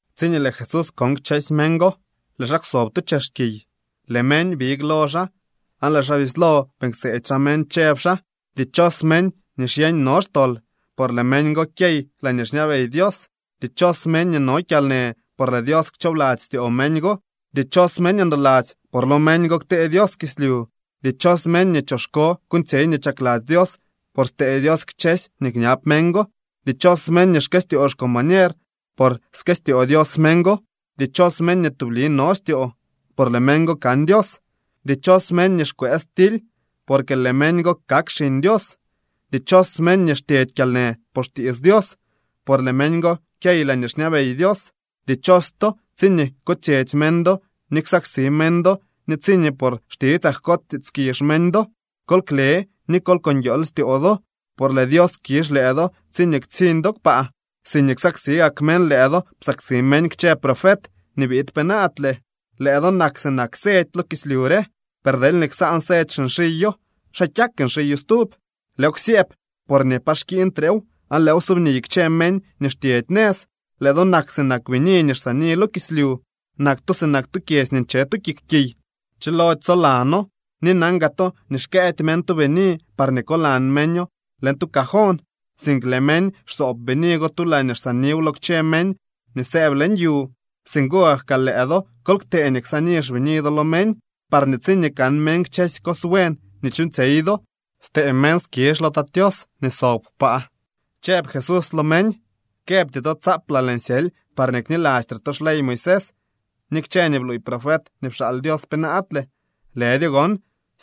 Tsiñee Lëë Jesús kon kchësy meñ go, lëë xaa kwsob tu chex kiy. Lëë meñ big lo xaa aan lëë xaa bislo beeñ kseedy xaa meñ chëb xaa: —Dichos meñ nii xyeñ no xtol, por lëë meñ go kyey laañee xñabey Dios. ’Dichos meñ nii no kyalnë, por lëë Dios kchoobladzy styoo meñ go. ’Dichos meñ ndoladzy, por lo meñ go ktee Dios kislyu. ’Dichos meñ nii choxko kuuñtsyey nii chakladzy Dios por stee Dios kchësy nii kñab meñ go. ’Dichos meñ nii xkëstyoo xcombañer, por skëstyoo Dios meñ go. ’Dichos meñ nii tubli no styoo, por lëë meñ go kan Dios. ’Dichos meñ nii xkwëës tily, porque lëë meñ go kak xiñ Dios. ’Dichos meñ nii xtyedy kyalnë por xtiits Dios, por lëë meñ go kyey laañee xñabey Dios. ’Dichos to, tsiñee kutsyetsy meñ do ni ksaksi meñ do ni tsiñee por xtitsaa jkots tiitskizh meñ do. Kol kle ni kol ko nguiool styoo do, por lëë Dios kizh lëë do tsiñee ktsiñ do kpaa. Siñee xsaksi gak meñ lëë do psaksi meñ kchë profet nii biid penaadle. ’Lëë do nak sinak sedy lo kislyu re. Per deelñee ksaan sedy xinxiyo, ¿xa kyak nxiyo stub? Lëëw ksyëëb porñee pa xkiiñtrew aan lëëw subniy kchë meñ nii xtyedy nëz. ’Lëë do nak sinak bini nii xsaani lo kislyu. Nak to sinak tu kyedzy nii nche tu kik kiy. Chilody tsolano. Ni nan gaa to nii xkëëdy meñ tu bini parñee kolan meño leñ tu cajón, sink lëë meñ xsoob bini go tu laañee ksaaniw lo kchë meñ nii sëëb leñ yu. Singo gak kaa lëë do kol ktee nii ksaani xbini do lo meñ, parñee tsiñee kan meñ kchësy cos buen nii chuuñtsyey do, stee meñ skizh lo Tat Tios nii sob kpaa. Chëb Jesús lo meñ: —Këbty to tsaaplaa lëën syely parñee knilastre to xley Moisés ni kchë nii bluuy profet nii pxaal Dios penaadle. Lëdyo gon,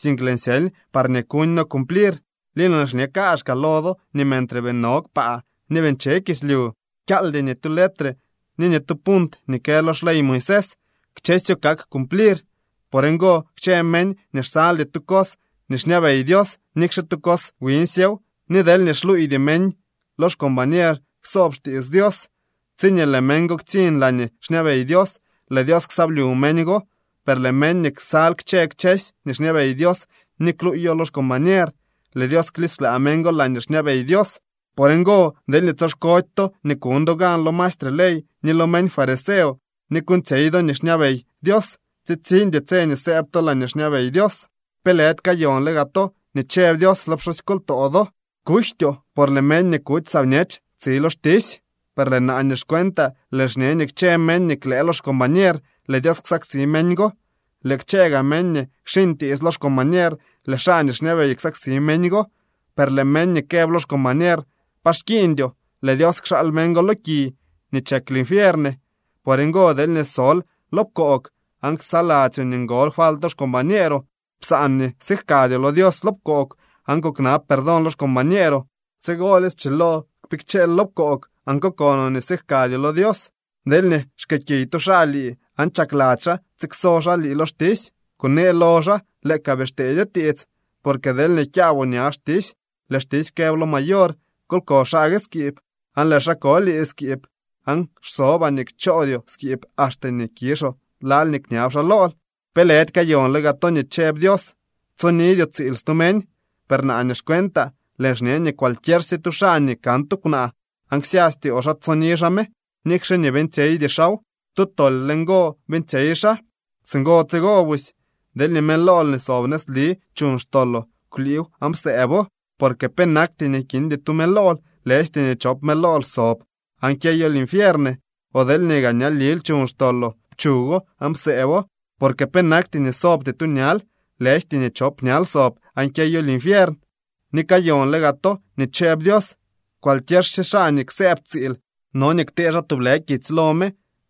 sink lëën syely parñee kuñno cumplir. Ni lëën xñe kaazhkaa lo do nii mentre bii no kpaa ni bii nche kislyu, kyaaldy ni tu letre ni ni tu punt nii kë lo xley Moisés. Kchësyo kak cumplir. Por ngo, kchë meñ nii xsaldy tu cos nii xñabey Dios, nikxe tu cos wiñsyew, ni deelñee xluuydy meñ lo xcombañer ksoob xtiits Dios, tsiñee lëë meñ go ktsiñ laañee xñabey Dios, lëë Dios ksyablyu meñ go. Per lëë meñ nii ksal kchë kchësy nii xñabey Dios ni kluuyo lo xcombañer, lëë Dios klisklaa meñ go laañee xñabey Dios. Por ngo, deelñee tsoxkody to nii kuñ do gan lo maestre ley ni lo meñ fariseo nii kuuñtsyey do nii xñabey Dios, tsitsiñdy tse nii sëëb to laañee xñabey Dios. ’Pe lëdy kayonle gaa to nii chëb Dios lo pxusykoltoo do: “Kujtyoo, por lëë meñ nii kuty saa bñech tsi lo xtisy.” Per naa nii xcuentaa, lëën xñe nii kchë meñ nii klëë lo xcombañer, lëë Dios ksaksi meñ go. Lëë kchë gaa meñ nii kxiñ tiits lo xcombañer, lëë xaa nii xñabey ksaksi meñ go. Per lëë meñ nii këb lo xcombañer: “Pa xkiiñdyoo”, lëë Dios kxaal meñ go lo ki nii chek linfiern. ’Por ngo, deelñee sol lo pkoog aan ksaladzyoo nii ngol falt lo xcombañeeroo, psaan nii sijkadyoo lo Dios lo pkoog aan kuknab perdón lo xcombañeeroo. Tsigolye schilo kpikcheel lo pkoog aan kokonoo nii sijkadyoo lo Dios. ’Deelñee xkëëkiy tu xaa lii aan chakladzy xaa tsikso xaa lii lo xtisy, kunee lo xaa lëë ka bii xteedyo tiits, porque deelñee kyaaboo ña xtisy, lëë xtisy këb lo mayor: “Kol ko xaa gue skiib”, aan lëë xaa ko lii skiib. Aan xsobaa nii kchoodyoo skiib axte nii kizhoo lal nii kñab xaa lool. ’Pe lëdy kayonle gaa to nii chëb Dios: “Tsonidyoo tsiil stu meñ.” Per naa nii xcuentaa lëën xñe nii cualquiersye tu xaa nii kan tu kwnaa aan ksya styoo xaa tsoni xaa me, nikxe nii beeñtsyeydy xaaw, tu tol le ngo beeñtsyey xaa. ’Singo tsigo busy, deelñee mëlool nii sob nëzli chuñ xtoloo, kwliiw aan psëëbo. Porque penakty nii kindy tu mëlool, lëjty nii chop mëlool sob aan kyeyoo linfiern. O deelñee gaa ñalil chuñ xtoloo, pchugo aan psëëbo, porque penakty nii sobty tu ñal, lëjty nii chop ñal sob aan kyeyoo linfiern. ’Ni kayonle gaa to nii chëb Dios: “Cualquiersye xaa nii ksëëb tsiil no nii ktee xaa tublë kitsy lo me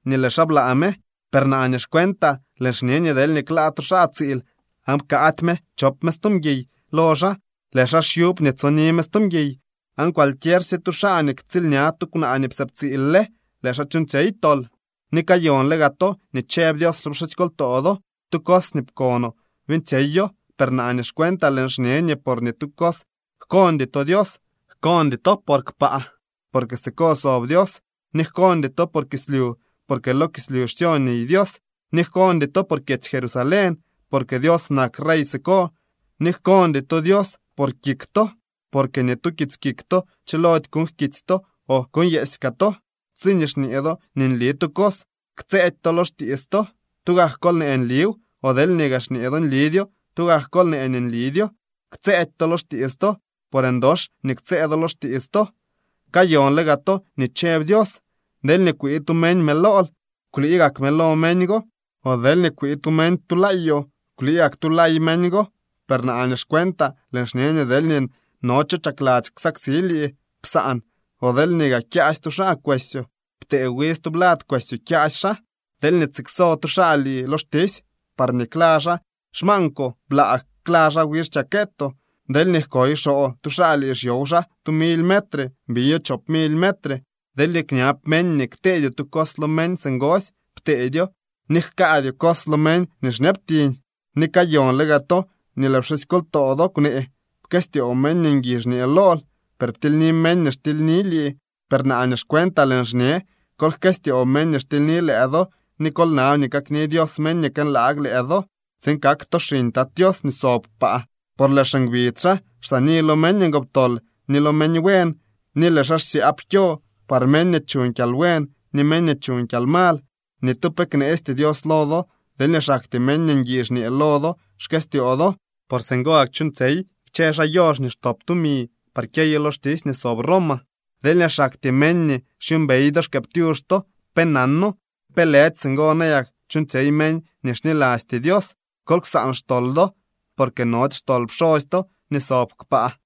nii lëë xaa blaa me.” Per naa nii xcuentaa lëën xñe nii deelñee klaa tu xaa tsiil aan pkaady me chop me stu mguiy lo xaa, lëë xaa xyub nii tsoni me stu mguiy. Aan cualquiersye xaa nii ktsiilña tu kwnaa nii psëëb tsiil le, lëë xaa chuuñtsyey tol. ’Ni kayonle gaa to nii chëb Dios lo pxusykoltoo do: “Tu cos nii pkonoo beeñtsyeyo.” Per naa nii xcuentaa lëën xñe nii por ni tu cos jkondy to Dios. Jkondy to por kpaa, porque siko sob Dios, ni jkondy to por kislyu, por lo kislyu xsyo niy Dios, ni jkondy to por kyedzy Jerusalén, porque Dios nak rey siko. Ni jkondy to Dios por kik to, porque ni tu kits kik to chilody kuuñ jkiitsy to o kuuñnyeesy kaa to. Tsiñee xñee do nii nli tu cos, ktsëëdy to lo xtiits to, tugak kol nee nliw. O deelñee gaa xñee do nlidyo, tugak kol nee nii nlidyo, ktsëëdy to lo xtiits to, por ndox nii ktsëë do lo xtiits to. ’Kayonle gaa to nii chëb Dios: “Deelñee kwii tu meñ mëlool, kwlii gak mëlo meñ go, o deelñee kwii tu meñ tu laayoo, kwlii gak tu lay meñ go.” Per naa nii xcuentaa lëën xñe nii deelñee no cho chakladzy ksaksi lii, psaan, o deelñee gaa kyaasy tu xaa kwesyoo, ptee wi stublad kwesyoo kyaasy xaa. Deelñee tsikso tu xaa lii lo xtisy parñee kla xaa xmaankwoo, blaa kla xaa wi xchakeetoo. Deelñee jkoy xoo tu xaa lii xyow xaa tu mily metre, biyo chop mily metre. Deelñee kñab meñ nii kteedyoo tu cos lo meñ singosy, pteedyo, ni jkaadyoo cos lo meñ nii xñabtiñ. ’Ni kayonle gaa to nii lëë pxusykoltoo do kwnee: “Pkëstyoo meñ nii ngui xñee lool, per ptilyni meñ nii xtilyni lii.” Per naa nii xcuentaa lëën xñe: Kol jkëstyoo meñ nii xtilyni lëë do ni kol nab nii kakni Dios meñ nii kënlaag lëë do, tsiin kak to xiñ Tat Tios nii sob kpaa. Por lëë xingbidz xaa xsaani lo meñ ngoptol ni lo meñ buen, ni lëë xaa xsyaab kyo par meñ nii chuñ kyalbuen ni meñ nii chuñ kyalmal. Ni tu pe kneesty Dios lo do deelñee xaktyee meñ nii ngui xñee lo do xkëstyoo do. Por singo gak chuuñtsyey kchë xaa yoox nii xtop tumi par kyeyo lo xtisy nii sob Roma. Deelñee xaktyee meñ nii xyuumbey do xkëëptyux to, pe nano. ¿Pe lëdy singo nayak chuuñtsyey meñ nii xnilasty Dios? Kol ksaan xtol do, porque nody xtol pxosy to nii sob kpaa.